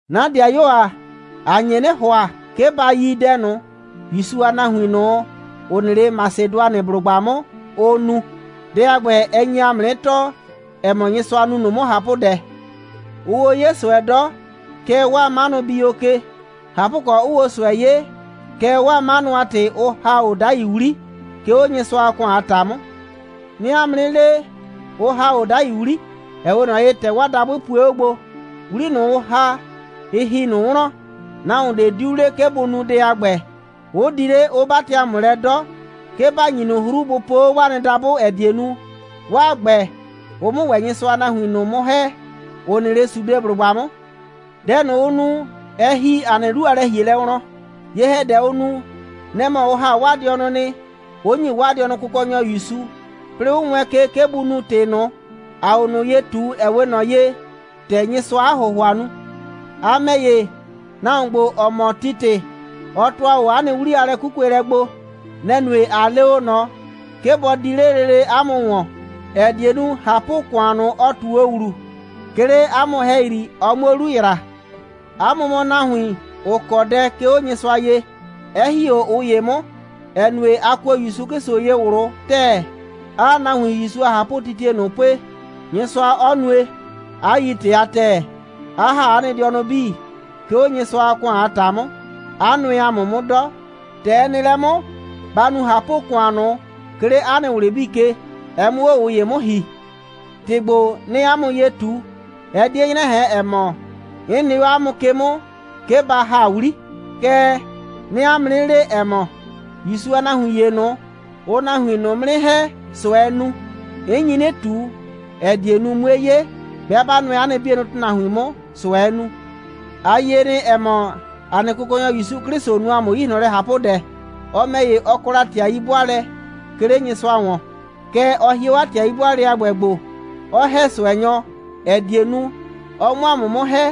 'Na ‑dɩayuo ‑a, ‑a nye 'nɩ ‑hʋa, 'ke ba yi dɛ ꞊nʋ, ‑Yusu a nahuin ꞊nʋ, ‑ʋ nɩ 'le Masɩdʋanɩblʋgba 'mʋ, ʋ nu. Dɛ a ‑gbɛ, ɛ nye ‑a mʋ 'nɩ tɔɔ, ‑ɛ mɔ, Nyɩsʋa nu ꞊nʋ 'mʋ ꞊hapʋdɛ. Ʋʋ o 'ye ꞊sʋɛ 'dɔ, kɛɛ, 'waa 'manʋ bii o ke. ꞊Hapʋkɔ, 'ʋʋ o ꞊sʋɛ 'ye, kɛɛ, 'waa 'manʋ a ‑tɩ, 'ʋ ‑ha o 'dai 'wli, 'ke 'o Nyɩsʋa a ‑kʋan a ‑ta 'mʋ. 'Nɩɩ 'a mʋ 'nɩ le, ʋ ‑ha o 'dai 'wli, ‑ɛ 'we ꞊nɔ ye, ‑tɛ 'waa dabʋɩ pue 'o gbo. 'Wli ꞊nʋ, ʋ ‑ha, ɩ ‑hi ꞊nʋ wlɔn. Nahuon ꞊de 'diu le, 'ke bʋ nu dɛ a ‑gbɛ, 'ʋ di 'le, 'ʋ 'batɩ ‑a mʋ lɛ 'dɔ, 'ke ‑ba ‑nyi ꞊nʋ 'hru, bʋ po 'o 'waa nɩ dabʋ, ‑ɛ die nu, 'waa ‑gbɛ, ʋ 'mʋ ‑wɛ Nyɩsʋa a nahuin ꞊nʋ 'mʋ ‑hɛ, ‑ʋ nɩ 'le Sudeblʋgba 'mʋ. Dɛ ꞊nʋ, ʋ nu, ɛ ‑hi ‑a nɩ 'lu a lɛ‑hielɛ wlɔn. Ye‑hɛdɛ, ʋ nu, nɛ‑ mɔ ʋ ‑ha 'waa dɩɔnʋ nɩ, 'ʋ ‑nyi 'waa dɩɔnʋ Kʋkɔnyɔ ‑Yusu, 'plɩɩ 'ʋ wɛɛn ke, 'ke bʋ nu ‑tɩ ꞊nʋ, ‑aa o ꞊nʋ ye ꞊tu, ‑ɛ 'we ꞊nɔ ye, ‑tɛ Nyɩsʋaa 'a ‑hʋhʋa nu. A ‑mɛ ‑ye, nahuon ‑gbo, ‑ɔ mɔ Titɩ, ɔ ‑tʋa o 'a nɩ 'wli a lɛ'kukuelɛ gbo. Nɛ‑ nue, ꞊a le o ꞊nɔ, 'ke bɔ di 'le lele 'a mʋ ‑wɔn, ‑ɛ die nu, ꞊hapʋ‑kʋan ꞊nʋ, ɔ ꞊tu o ‑wlu, 'ke 'le 'a mʋ ‑hɛyri, ɔ 'muo 'lu ‑yra. 'A mʋ mɔ nahuin, ‑ʋ kɔ dɛ, 'ke 'o Nyɩsʋa ye, 'ɛ ‑hi 'o ꞊ʋ ‑ye 'mʋ, ‑ɛ nue, a kuo ‑Yusu 'Klɩsʋ ye ꞊wlʋ ‑tɛɛ, 'aa nahuin ‑Yusu a ꞊hapʋtitie ꞊nʋ pue, Nyɩsʋa 'ɔ nue, 'a yi ‑tɩ a ‑tɛɛ, 'a ‑ha 'a nɩ dɩɔnʋ 'bii, 'ke 'o Nyɩsʋa a ‑kʋan a ‑ta 'mʋ, 'a nʋɛ ‑a mʋ 'mʋ 'dɔ. ‑Tɛ ɛ nɩ lɛ 'mʋ, ba nu ꞊hapʋ‑kʋan ꞊nʋ, 'ke 'le 'a nɩ ꞊wlɩ 'bii ke, ɛ 'mʋ 'o ꞊ʋ ‑ye 'mʋ ‑hi. ‑Tɩ ‑gbo, 'nɩɩ 'a mʋ ye ꞊tu, ɛ 'die 'nyrɛ ꞊hɛn, ‑ɛ mɔ, 'n nɩ 'o 'a mʋ ke 'mʋ, 'ke ba ‑ha 'wli. Kɛɛ, 'nɩɩ 'a mʋ 'nɩ le, ‑ɛ mɔ, ‑Yusu a nahuin ‑ye ꞊nʋ, ʋʋ nahuin ꞊nʋ 'mʋ 'nɩ ‑hɛ, ꞊sʋɛɛ nu. 'N nyi 'nɩ ꞊tu, ‑ɛ die nu, 'mue 'ye, 'bɩa 'ba nʋɛ 'a nɩ 'bienʋ ‑tʋnahuin ꞊nʋ 'mʋ, ꞊sʋɛɛ nu. A yie nɩ, ‑ɛ mɔ, ‑a nɩ Kʋkɔnyɔ ‑Yusu 'Klɩsʋ nu ‑a mʋ 'yi ꞊hlɔn lɛ ꞊hapʋdɛ. Ɔ ‑mɛ ‑ye, ɔ kɔ la ‑tɩ a 'yi'bʋaalɛ, 'ke 'le Nyɩsʋa ‑wɔn. Kɛɛ, ɔ hie 'o 'a ‑tɩ a 'yi'bʋaalɛ a ‑gbɛ gbo, 'ɔ ‑hɛ ꞊sʋɛnyɔ, ‑ɛ die nu, ɔ 'mʋ 'a mʋ 'mʋ ‑hɛ.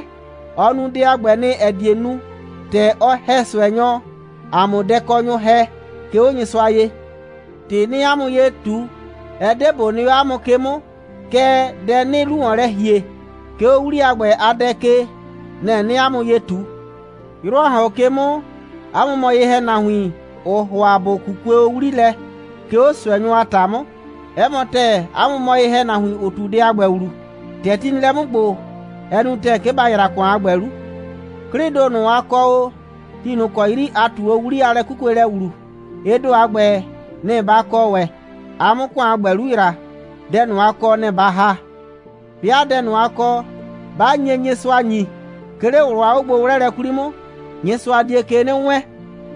Ɔ nu dɛ a ‑gbɛ nɩ, ‑ɛ die nu, ‑tɛ ɔ ‑hɛ ꞊sʋɛnyɔ, a 'mʋ dɛkɔnyʋ ‑hɛ, 'ke 'o Nyɩsʋa ye. ‑Tɩ 'nɩɩ 'a mʋ ye ꞊tu, ɛ 'de ꞊bo nɩ 'o 'a mʋ ke 'mʋ, kɛɛ, dɛ 'nɩɩ 'lu ‑wɔn lɛ ‑hie, 'ke 'o 'wli a ‑gbɛ a dɛ ke, nɛ‑ 'nɩɩ 'a mʋ ye ꞊tu. 'Yrʋ, ‑a ‑hɔn 'o ke 'mʋ, 'a mʋ mɔ o ye‑hɛnahuin, ‑ʋʋ ‑hʋa ‑bʋ 'kukue o 'wli lɛ, 'ke 'o ꞊sʋɛnyʋ a ‑ta 'mʋ. 'Ɛ mɔ ‑tɛɛ, 'a mʋ mɔ ye‑hɛnahuin, ‑ʋ ꞊tu dɛ a ‑gbɛ ‑wlu. ‑Tɛ ti nɩ lɛ 'mʋ ‑gbo, ɛ nu ‑tɛɛ, 'ke ba ‑yra ‑kʋan a ‑gbɛ 'lu. 'Klɩɩ ‑do ꞊nʋ, a kɔ o, ti ꞊nʋ ‑kɔ 'yri, a ꞊tu o 'wli a lɛ'kukuelɛ ‑wlu, ɩ ‑do a ‑gbɛ, nɩ‑ ba kɔ ‑wɛ, a 'mʋ ‑kʋan a ‑gbɛ 'lu ‑yra. Dɛ ꞊nʋ, a kɔ, nɛ‑ ba ‑ha. 'Bɩa dɛ ꞊nʋ, a kɔ, 'ba nye Nyɩsʋa ‑nyi, 'ke 'le ꞊wlʋ a 'ogbo'wlɛɛlɛ 'kwli 'mʋ, Nyɩsʋa die ke 'nɩ wɛɛn.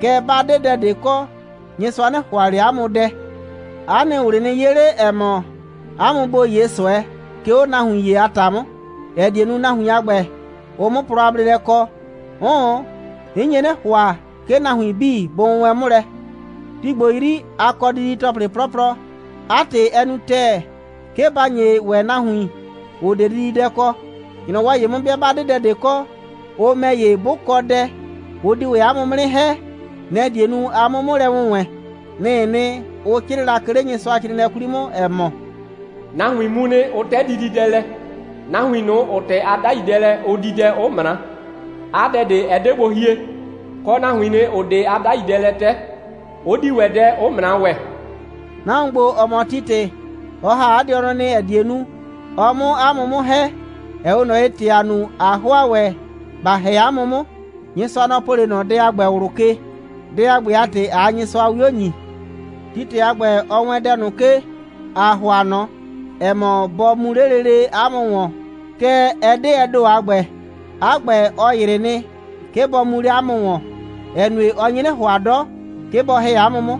Kɛɛ, 'ba 'de dɛ ꞊de kɔ, Nyɩsʋa 'nɩ ‑hʋa ꞊le 'a mʋ dɛ. 'A nɩ ꞊wlɩ nɩ 'ye 'le, ‑ɛ mɔ, 'a mʋ ‑bo 'ye ꞊sʋɛ, 'ke 'o nahuin ‑ye a ‑ta 'mʋ, ‑ɛ die nu, nahuin a ‑gbɛ, ʋ 'mʋ plɔ a bleelɛ kɔ. 'Ʋʋn, 'n nye 'nɩ ‑hʋa, 'ke nahuin 'bii bʋ wʋnwɛɛn 'mʋ lɛ. Ti ‑gbo 'yri, a kɔ didi‑tɔplɩ 'plɔplɔ. 'A ‑tɩ, ɛ nu ‑tɛɛ, 'ke ba ‑nye ‑wɛ nahuin, ‑ʋ 'de dididɛ kɔ. ‑Nyrɔwɔ ‑ye 'mʋ, 'bɩa 'ba 'de dɛ ꞊de kɔ, ʋ ‑mɛ ‑ye, 'bʋ kɔ dɛ, ʋ di ‑wɛ 'a mʋ 'mʋ 'nɩ ‑hɛ. Nɛ‑ die nu, a 'mʋ 'mʋ lɛ wʋnwɛɛn. Nɩ‑ɩ nɩ, ʋ 'crɩɩ la, 'ke 'le Nyɩsʋacrɩɩnɩɛ 'kwli 'mʋ, ‑ɛ mɔ: «Nahuin mu nɩ, 'ʋ 'tɛ dididɛ lɛ, nahuin ꞊nʋ, ‑ʋ 'tɛ 'a 'dai dɛ lɛ, 'ʋ di dɛ, 'ʋ ꞊mra, 'a dɛ ꞊de 'ɛ 'de gbo hie, kɔ, nahuin ꞊nʋ, ‑ʋ 'de 'a 'dai dɛ lɛ 'tɛ, 'ʋ di ‑wɛ dɛ, 'ʋ ꞊mra ‑wɛ.» Nahuon ‑gbo, ‑ɔ mɔ Titɩ, ɔ ‑ha 'a dɩɔnʋ nɩ, ‑ɛ die nu, ɔ 'mʋ 'a mʋ 'mʋ ‑hɛ, ‑ɛ 'we ꞊nɔ ye, ‑tɛ ‑a nu, ꞊a ‑hʋa ‑wɛ ‑ba ‑hɛ 'a mʋ 'mʋ. Nyɩsʋa, nɔ‑ po 'le ꞊nɔ dɛ a ‑gbɛ ꞊wlʋ ke. Dɛ a ‑gbɛ a ‑tɩ, ꞊aa Nyɩsʋa 'wio ‑nyi. Titɩ a ‑gbɛ, ɔ wɛɛn dɛ ꞊nʋ ke, ‑a ‑hʋa ꞊nɔ, ‑ɛ mɔ, bɔ mu 'le lele 'a mʋ ‑wɔn. Kɛɛ, ɛ 'de ɛ ‑do a ‑gbɛ. 'A ‑gbɛ, ɔ ‑yrɩ nɩ, 'ke bɔ mu 'le 'a mʋ ‑wɔn, ‑ɛ nue, ɔ nye 'nɩ ‑hʋa 'dɔ, 'ke bɔ ‑hɛ 'a mʋ 'mʋ.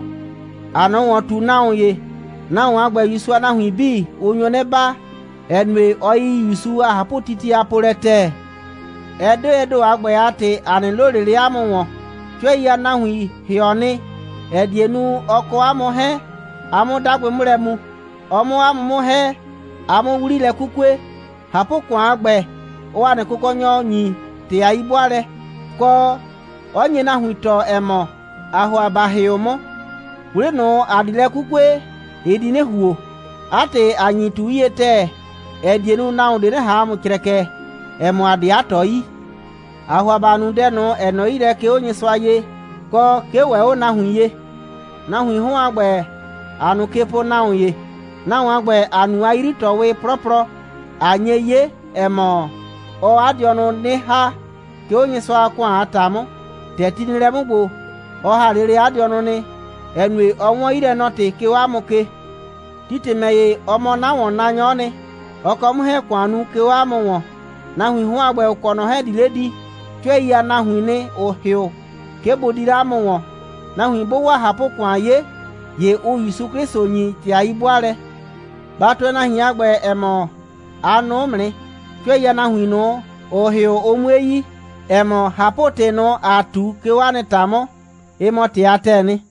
‑Aa ꞊nɔ ‑wɔn ꞊tu nahuon ‑ye. Nahuon a ‑gbɛ, ‑Yusu a nahuin 'bii, ʋ nyo 'nɩ baa, ‑ɛ nue, ɔ yi ‑Yusu a ꞊hapʋtitie a polɛ ‑tɛɛ. Ɛ 'de ɛ ‑do a ‑gbɛ a ‑tɩ, ‑a 'nɩ loo ꞊le 'le 'a mʋ ‑wɔn. 'Cʋɛi a nahuin ‑hɩɔ nɩ, ‑ɛ die nu, ɔ kɔ ‑a mʋ 'hɛɛn, ‑a 'mʋ 'dagbɩ 'mʋ lɛ mu, ɔ 'mʋ ‑a mʋ 'mʋ ‑hɛ, ‑a 'mʋ 'wli lɛ 'kukue. ꞊Hapʋ‑kʋan a ‑gbɛ, ɔɔ ‑a nɩ Kʋkɔnyɔ ‑nyi ‑tɩ a 'yi'bʋaalɛ, kɔ, 'ɔ nye nahuin tɔɔ, ‑ɛ mɔ, ‑aa ‑hʋa ‑ba ‑hɩʋ 'mʋ. 'Wli ꞊nʋ, ‑a di lɛ 'kukue, ɩ di 'nɩ ‑huo. 'A ‑tɩ, ‑a nyi ꞊tu 'yie ‑tɛɛ, ‑ɛ die nu, nahuon ꞊de 'nɩ ꞊han ‑a mʋ crɛkɛ, ‑ɛ mɔ, ‑a 'de 'a ꞊tɔ yi. ‑Aa ‑hʋa ‑ba nu dɛ ꞊nʋ, ‑ɛ nɔ 'yi lɛ, 'ke 'o Nyɩsʋa ye, kɔ 'ke ‑wɛ 'o nahuin ye. Nahuiin 'hɔn a ‑gbɛ, ‑aa ꞊nʋ ke po nahuon ‑ye. Nahuon a ‑gbɛ, ‑a nu 'a 'yri꞊tɔɔwɩ 'plɔplɔ, ꞊a nye 'ye, ‑ɛ mɔ, ɔɔ 'a dɩɔnʋ 'nɩ ‑ha, 'ke 'o Nyɩsʋa a ‑kʋan a ‑ta 'mʋ. ‑Tɛ ti nɩ lɛ 'mʋ ‑gbo, ɔ ‑ha lele 'a dɩɔnʋ nɩ, ‑ɛ nue, ɔ 'wɔn 'yilɛnɔ‑tɩ, 'ke 'o 'a mʋ ke. Titɩ ‑mɛ ‑ye, ɔ mɔ 'na ‑wɔnnaanyɔ'ɔ nɩ. Ɔ kɔ 'mʋ 'hɛɛn‑ ‑kʋan nu, 'ke 'o 'a mʋ ‑wɔn. Nahuiin 'hɔn a ‑gbɛ, ‑ʋ kɔ ꞊nɔ 'hɛɛn, ‑ʋ di 'le di, 'cʋɛi a nahuiin nɩ, ‑ʋ ‑hɩʋ, 'ke bʋ di 'le 'a mʋ ‑wɔn. Nahuin 'bʋʋ 'waa ꞊hapʋ‑kʋan 'ye, ‑ye ʋʋ ‑Yusu 'Klɩsʋ ‑nyi ‑tɩ a 'yi'bʋaalɛ. Ba tʋɛ nahuin a ‑gbɛ, ‑ɛ mɔ, a nʋʋ 'mʋ nɩ, 'cʋɛi a nahuin ꞊nʋ, ‑ʋ ‑hɩʋ, ʋ 'mue yi, ‑ɛ mɔ, ꞊hapʋ‑tɩ ꞊nʋ, ‑a ꞊tu, 'ke 'o 'a nɩ ‑ta 'mʋ, ‑ɩ mɔ ‑tɩ a ‑tɛɛ nɩ.